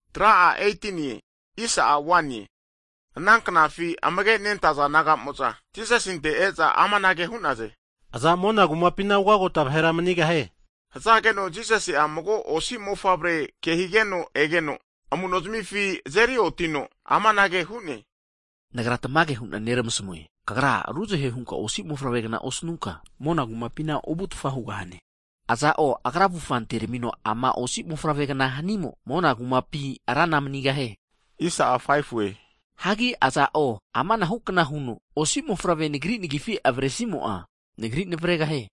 Hagi ana knafi amage nentaza disaipol naga'mo'za Jisasinte e'za amanage hu'naze. Aza mona kumapina ugagota vahera manigahie? Hazageno Jisasi'a mago osi mofavre ke higeno egeno, amunozamifi azeri otiteno, amanage hu'ne. Nagra tamage hu'na neramasmue, Tamagra ruzahe huta osi mofavre'gna osanuta, mona kumapina ovutfa hugahaze. Aza'o agra avufa antermino ama osi mofavre'gna hanimo, mona kumapi rana manigahie. Hagi aza'o ama anahukna huno osi mofavrema Nagri nagifima avresimo'a, Nagri navregahie.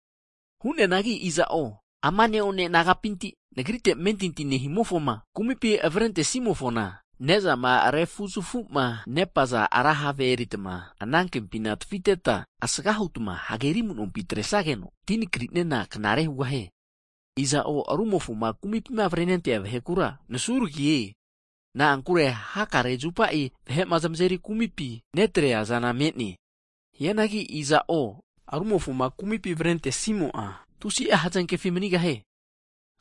Hu'neanagi iza'o ama ne'one mofavre nagapinti'ma Nagrite amentinti nehimofoma kumipi avarente'simofona, ne'zama refuzafuma nepaza ra have eritma anankempi tafiteta, asgahutma hageri amu'nompi atresageno tima nakriniana knare hugahie. Iza'o rumofoma kumipima avrenentea vahekura nasuragie, na'ankure hakare zupa vahe'ma zamazeri kumipi netreazana me'ne. Hianangi iza'o rumofoma kumipi avrentesimo'a tusi'a hazankefi manigahie. Hagi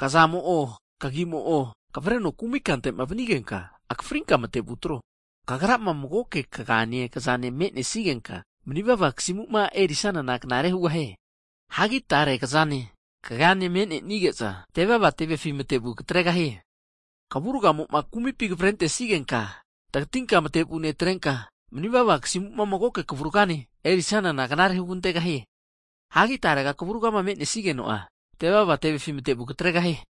kazamo'o, kagiamo'ma kavareno kumi kante'ma vanigenka, akafrinka matevu atro. Kagra'ma magoke kazane kaganema me'nesigenka manivava kasimuma erisanana knare hugahie. Hagi tare kazane kagane me'nenige'za tevava tevefi mate'vu katregahaze. Kavurgamo'ma kumipi kavrentesigenka, tagatinka matevu netrenka, manivava kasimuma magoke kavurgane erisanana knare hugantegahie. Hagi tarega kvurgama menesigeno'a, tevava tevefi matevu katregahie.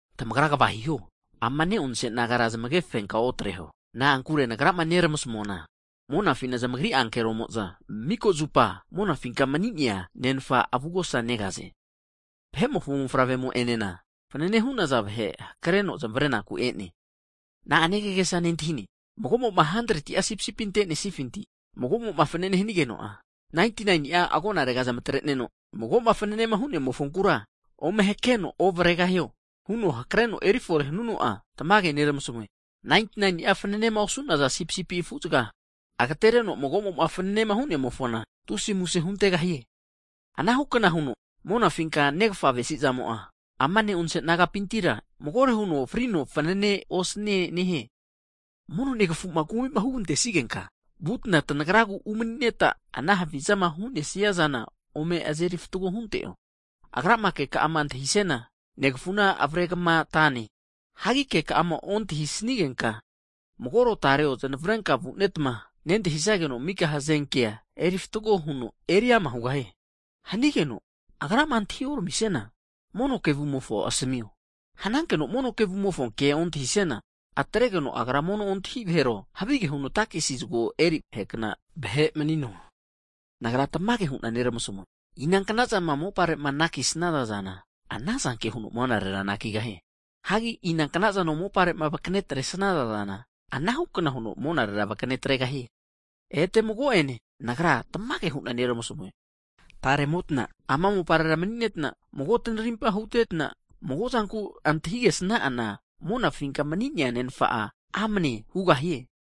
Tamagra kva hiho, amana ne'onse mofavre nagara zmage fenka otreho. Na'ankure Nagrama nermasmuana monafina zamagri ankeromo'za, mika zupa monafinka mani'nea Nenfa avugosa negaze. [Vahe'mofo mofavre'ma e'neana fanane hu'naza vahe hakreno zmarenaku e'ne.] Na'ane tamagesa nentahize? Magomo'ma 100'a sipisipi ante'nesnifinti, mago'ma fanane hanigeno'a, 99'a agonarega zamatreneno mago'ma fananema hu'nemofonkura ome hakreno ovregahio? A'o. Agra hakreno erifore hanuno'a, tamage neramasmue, 99ni'a fananema osu'naza sipisipi afuzaga agatereno mago'ma fananema hu'nemofona tusi'a muse huntegahie. Anahu kna huno, monafinka Nermafa avesi'zamo'a, ama ne'onse nagapintira magore huno frino fanane osanie nehie. Mono negafu'ma kumi'ma hugantesigenka, vutna tanagragu umani'neta ana havizama hu'nesia zana ome azeri fatgo hunto. Agrama keka'ama antahisiana, negfuna avare kamatane. Hagi keka'ama ontahisnigenka, magoro tareo znavrenka vunetma, nentahisageno mika hazenkea erifatgo huno eriama hugahie. Hanigeno agrama antahi oramisiana, mono kevumofo asamio. Hanankeno mono kevumofo ke ontahisiana, atregeno agra mono ontahi vahero, havige huno takesi zago eri vahekna vahe manino. Nagra tamage hu'na neramasmue, inankna zama mopare'ma anakisnaza zana, anazanke huno monarera anakigahie. Hagi inankna zama mopare'ma vakane atresnaza zana, anahu'kna huno monarera vakane atregahie. Ete mago'ene Nagra tamage hu'na neramasmue, taremotna ama moparera mani'netna, mago tnarimpa hutetna, mago'a zanku antahigesna'ana, monafinka mani'nea Nenfa'a amne hugahie.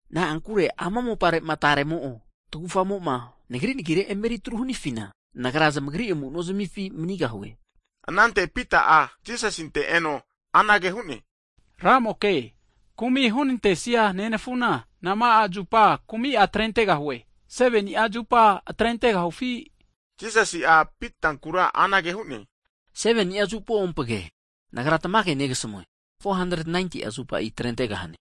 Na'ankure ama mopare'ma taremo'o tagufamo'za, Nagri nagire emeritru hanafina, Nagra zamagri amu'nozmifi manigahue. Anante Pita'a, Jisasinte eno anage hu'ne, Ramoke, kumi hunantesia nenafuna, nama'a zupa kumi'a atrentegahue, 7ni'a zupa atrentegahufi? Higeno Jisasi'a Pitankura anage hu'ne, 7ni'a zupo'ompge, Nagra tamage hu'na negasamue, 7ni'a 70'a zupa atrentegahane.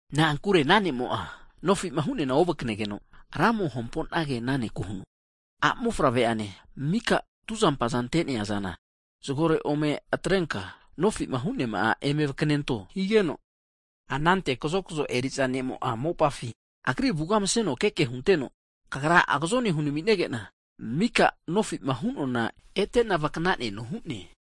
Na'ankure ana ne'mo'a nofima hu'neana ovaknegeno, ramo hamponage ana ne'ku huno, a'mofavre'ane mika tuzampaza ante'neazana zagore ome atrenka, nofima hu'neama'a etenka vaknento higeno, anante kazokzo eriza ne'mo'a mopafi agri avuga mseno keke hunteno, kagra agazone hunaminege'na, mika nofi'ma hunoana ete'na nagra vaknaneno hu'ne.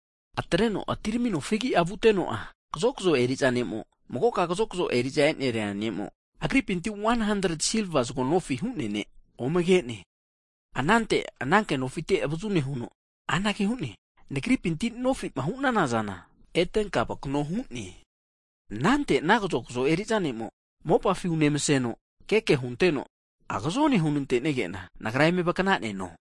Ana higeno atiramino fegi vuteno'a, magoka kazokazo eri'za eneri'a ne'mo agripinti 100'a silva zago nofi hu'nea ne' omege'ne. Anante ananke nofite avazu nehuno anage hu'ne, nagripinti nofi'ma hu'nana zana etenka vakano hu'ne. Anante ana kazokzo eri'za ne'mo mopafi unemaseno keke hunteno, agazone hu'nantenege'na nagra eme vaknaneno.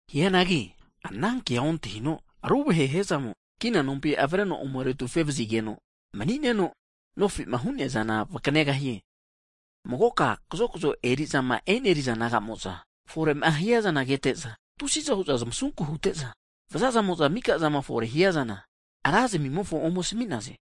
Hianagi ana kea ontahino ruvahe hiazamo kina nompi avreno ome retufe vazigeno mani'neno, nofi'ma hu'nea zana vaknegahie. Magoka kazokzo eri'zama eneriza naga'mo'za fore'ma hiazana kete'za, tusiza hu'za zamasunku hute'za vazamo'za mika zama fore hiazana ra zamimofo ome asmi'naze.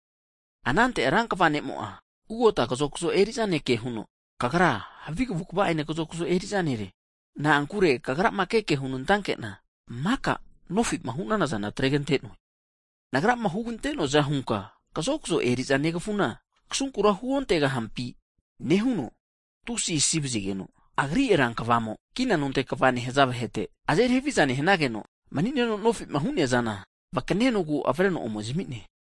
Anante rankva ne'amo'a ugota kazokzo eri'za ne' kehuno, Kagra havi kavukva'ene kazokzo eri'za nere! Na'ankure kagrama keke ke hunantake'na maka nofi'ma hu'nana zana atregante'noe. Nagrama hugante'noaza hunka kazokzo eri'za negafuna kasunkura huontegahampi? Nehuno tusi asi vazigeno, agri rankva'amo kina nonte kva nehaza vahete, azeri haviza nehanageno mani'neno nofi'ma hu'neaza vakanenogu avreno ome zami'ne.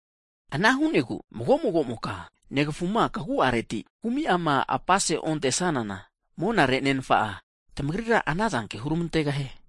Ana hu'negu, mago mago'mokama negafuma kagu'areti hunka kumi'ama apase ontesanana, monare Nenfa'a tamagrira anazanke hurmantegahie.